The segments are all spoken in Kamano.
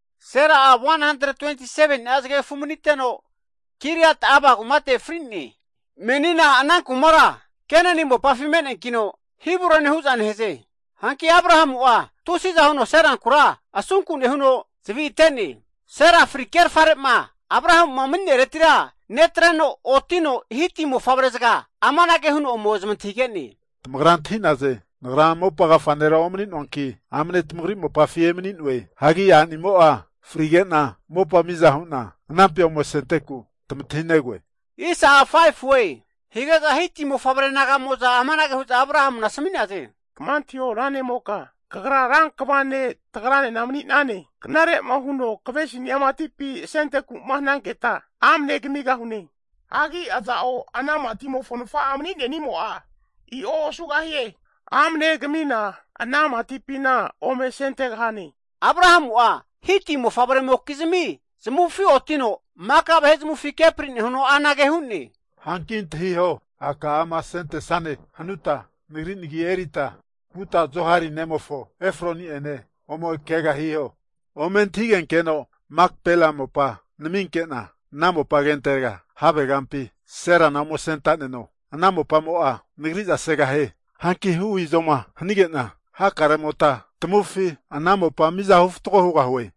Sera'a 127ni'a zagegafu maniteno, Kiriat-arba kumate fri'ne. Menina ana kumara Kenani mopafi me'neankino, Hebronie hu'za nehaze. Hanki Abrahamu'a tusi'za huno Serankura asunku nehuno zavi ate'ne. Sera fri kerfare'ma Abrahamu'a mani'nereti netreno otino Hiti mofavre'zaga amanage huno ome zamantahige'ne. Tamagra antahi'naze, nagra mopa agafa nera omani'noanki, amne tamagri mopafi emani'noe. Hagi a'nimo'a fri'nege'na mopa miza hu'na anampi ome asenteku tamantahinegoe. Hige'za Hiti mofavre naga'moza amanage hu'za Abrahamuna asami'naze. Kama antahio ra ne'moka, kagra ra kva ne' tagranena mani'nane. Knare'ma huno kavesinia matipi asenteku'ma hananketa, amne kamigahune. Hagi aza'o ana matimofo nafa'a mani'nenimo'a i'o osugahie. Amne kamina ana matimatipina ome asentegahane. Abrahamu'a Hiti mofavre'mokizmi zamufi otino, Maka vahe zamufi kepri huno anage hu'ne. Hanki antahiho! A' ka'ama asentesane hanuta, nagri nagi erita vuta Zohari nemofo, Efroni'ene ome keaga hiho. Ome antahigenkeno Makpela mopa naminke'na, ana mopa agentega havegampi Serana ome asentaneno. Ana mopamo'a nagri'za segahie. Hanki hu izoma hanige'na hakaremota tamufi ana mopa mizahu fatgo hugahue.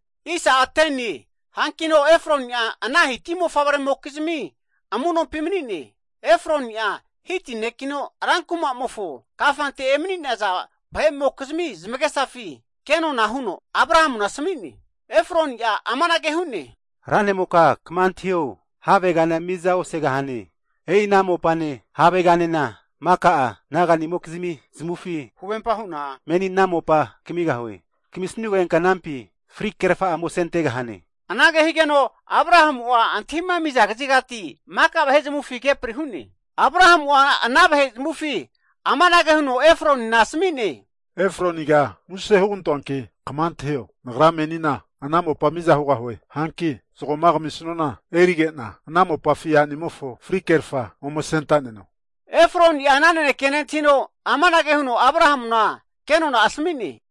Hankino Efroni'a ana Hiti mofavre'mokizmi amunompi mani'ne. Efroni'a Hiti ne'kino rankuma'mofo kafante emani'naza vahe'mokizmi zamagesafi, ke nona'a huno Abrahamuna asami'ne, Efroni'a amanage hu'ne, ra ne'moka kama antahio, havegana miza osegahane. E'i ana mopane haveganena maka'a naga'nimokizmi zamufi huvempa hu'na meni ana mopa kamigahue. Kamisnugenka anampi fri kerfa'a ome asente'gahane. Anage higeno Abrahamu'a antahima ami'za kazigati maka vahe zamufi kepri hu'ne. Abrahamu'a ana vahe zamufi amanage huno Efronina asami'ne. Efroniga muse (plis) hugantoanki kama antahio, nagra menina ana mopa miza hugahue. Hanki zagoma kamisnuana, erige'na ana mopafi a'nimofo fri kerfa ome asenta'neno. Efroni'a ana naneke nentahino, amanage huno Abrahamuna kenona'a asami'ne.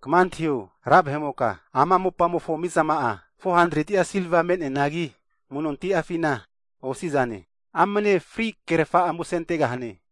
Kama antahio, ra vahe'moka, ama mopamofo mizama'a 400'a silva me'neanagi amu'nonti'afina osi'zane. Amne fri kerfa'a ome asentegahane.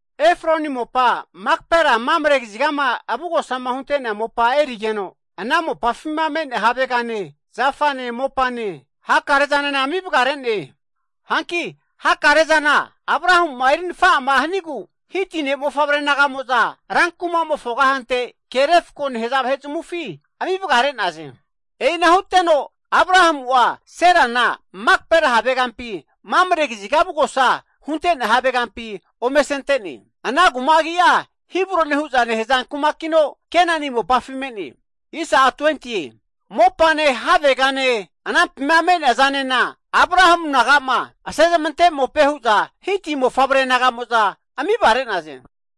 Efroni mopa Makpela Mamre kazigama avugosama hunte'nea mopa erigeno, ana mopafima me'nea havegane, zafane, mopane, hakarezanena ami vagare'ne. Hanki hakare'zana Abrahamu'ma eri nafa'a hanigu Hiti ne'mofavre naga'mo'za ran kuma'mofo kahante ke refko nehaza vahe'zmufi ami vagare'naze. E'ina huteno Abrahamu'a Serana Makpela havegampi, Mamre kaziga avugosa hunte'nea havegampi ome asente'ne. Ana kuma agi'a Hebron hu'za nehaza kumakino, Kenani mopafi me'ne. Mopane, havegane anampima me'nea zanena, Abrahamu naga'ma asezmante mope hu'za Hiti mofavre naga'mo'za ami vagare'naze.